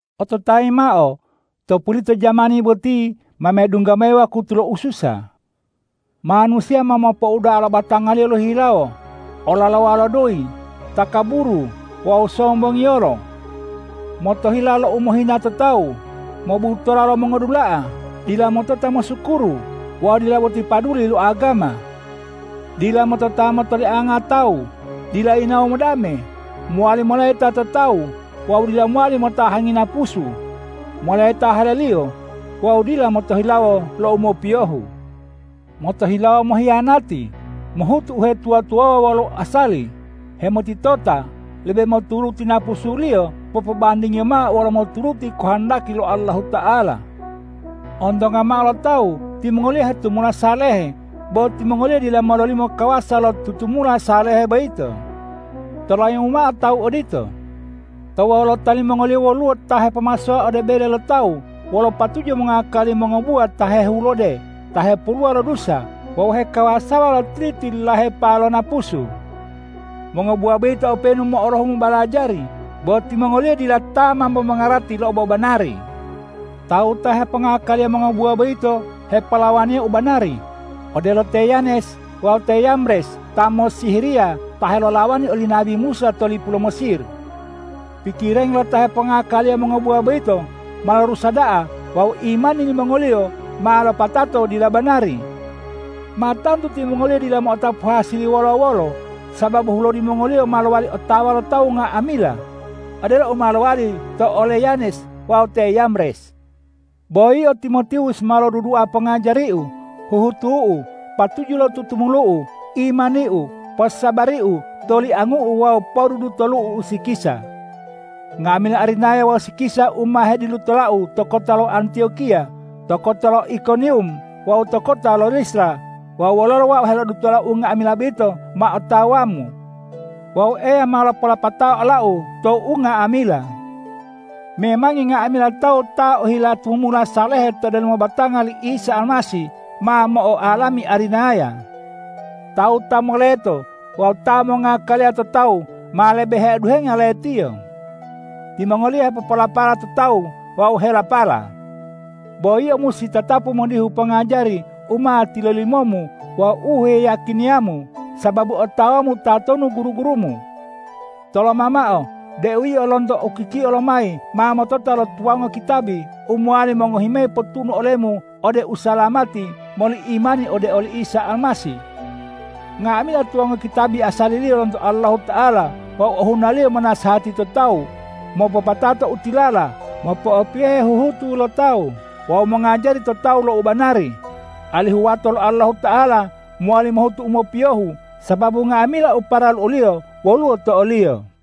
Ototayi mao: To pulito jamani boti ma medungga mayi wakutu lo ususa. Manusiya ma mopouda'a lo batangaliyo lohihilawo, olalowa lo doyi, takaburu wawu sombongiyolo. Motohila lo umohina to tawu, mobutola lo mongudula'a, dila motota mosukuru wawu dila boti paduli lo agama. Dila motota motoliango tawu, dila yinawo modame, mo'owali moleta to tawu wawu dila mowali motahangi napusu, moleta haleliyo wawu dila motohilawo lo u mopiyohu. Motohilawo mohiyanati, mohutu uhetuwa-tuwawuwa wolo uasali, hemotitota, lebe moturuti napusuliyo popobandingiyo mao wolo moturuti kohondaki lo Allahuta'ala. Ontonga mao lo tawu timongoliyo hetumula salehe, bo timongoliyo dila mololimo kawasa lo tutumula salehe boyito. Tolayimu mao tawu odito. To wolota limongoliyo woluwo ta hepomasowa ode bele lo tawu wolo patuju mongakali mongobuwa ta hehulode ta hepoluwa lo dusa wawu hekawasawa lo tili-tililahepa lo napusu. Mongobuwa boyito openu mo'olohu mobalajari, bo timongoliyo dila ta mambo mongarati lo obobanari. Tawu ta hepongakaliya mongobuwa boyito hepolawaniya u banari, odelo te Yanes wawu te Yambres ta mossihiriya ta helolawani oli nabi Musa to lipu lo Mesir. Pikirangi lo ta hepongakaliya mongobuwa boyito ma lorusa da'a wawu imani limongoliyo ma lopatato dila banari. Ma tantu timongoliyo dila mo'otapu hasili wolo-wolo, sababu hulodi mongoliyo ma mowali otawa lo tawu nga'amila, odelo u ma lowali to ole Yanes wawu te Yambres. Bo yio Timotiwus ma lodudua pongajariu, huhutu'u, patuju lo tutumulu'u, imaniu, posabariu, toliangu'u wawu podudutolu'u usikisa. Nga'amila arinaya wawu usikisa u ma hedilutolau to kota lo Antiyokiya, to kota lo Ikoniwum wawu to kota lo Listra wawu wololo wau helodutola unga'amila boyito ma otawamu. Wawu Eya ma lopolopatao olau to unga'amila. Memangi nga'amila tawu ta ohila tumumula salehe to delomo batanga li Isa Almasih, ma mo'oalami arinaya. Tawu ta moleto wawu ta mongngakaliya to tawu ma lebe heoduhenga letiyo. Timongoliyo hepopolapala to tawu wawu helapala. Bo yio musi tatapu modihu pongajari u ma tilolimomu wawu u heyiyakiniyamu, sababu otawamu tatonu guru-gurumu. Toloma mao deu yio lonto ukikio lomayi ma motota lo tuwango kitabi u mowali mongohi mayi potunu olemu ode usalamati moli imani ode oli Isa Almasih. Nga'amila tuwango kitabi asaliliyo lonto Allahuta'ala wawu ohunaliyo monasehati to tawu, mopopatato u tilala, mopo'opiyohe huhutu lo tawu wawu mongajari to tawu lo u banari, alihu wato lo Allahuta'ala mowali mohutu u mopiyohu, sababu nga'amila u paralu oliyo woluwo to oliyo.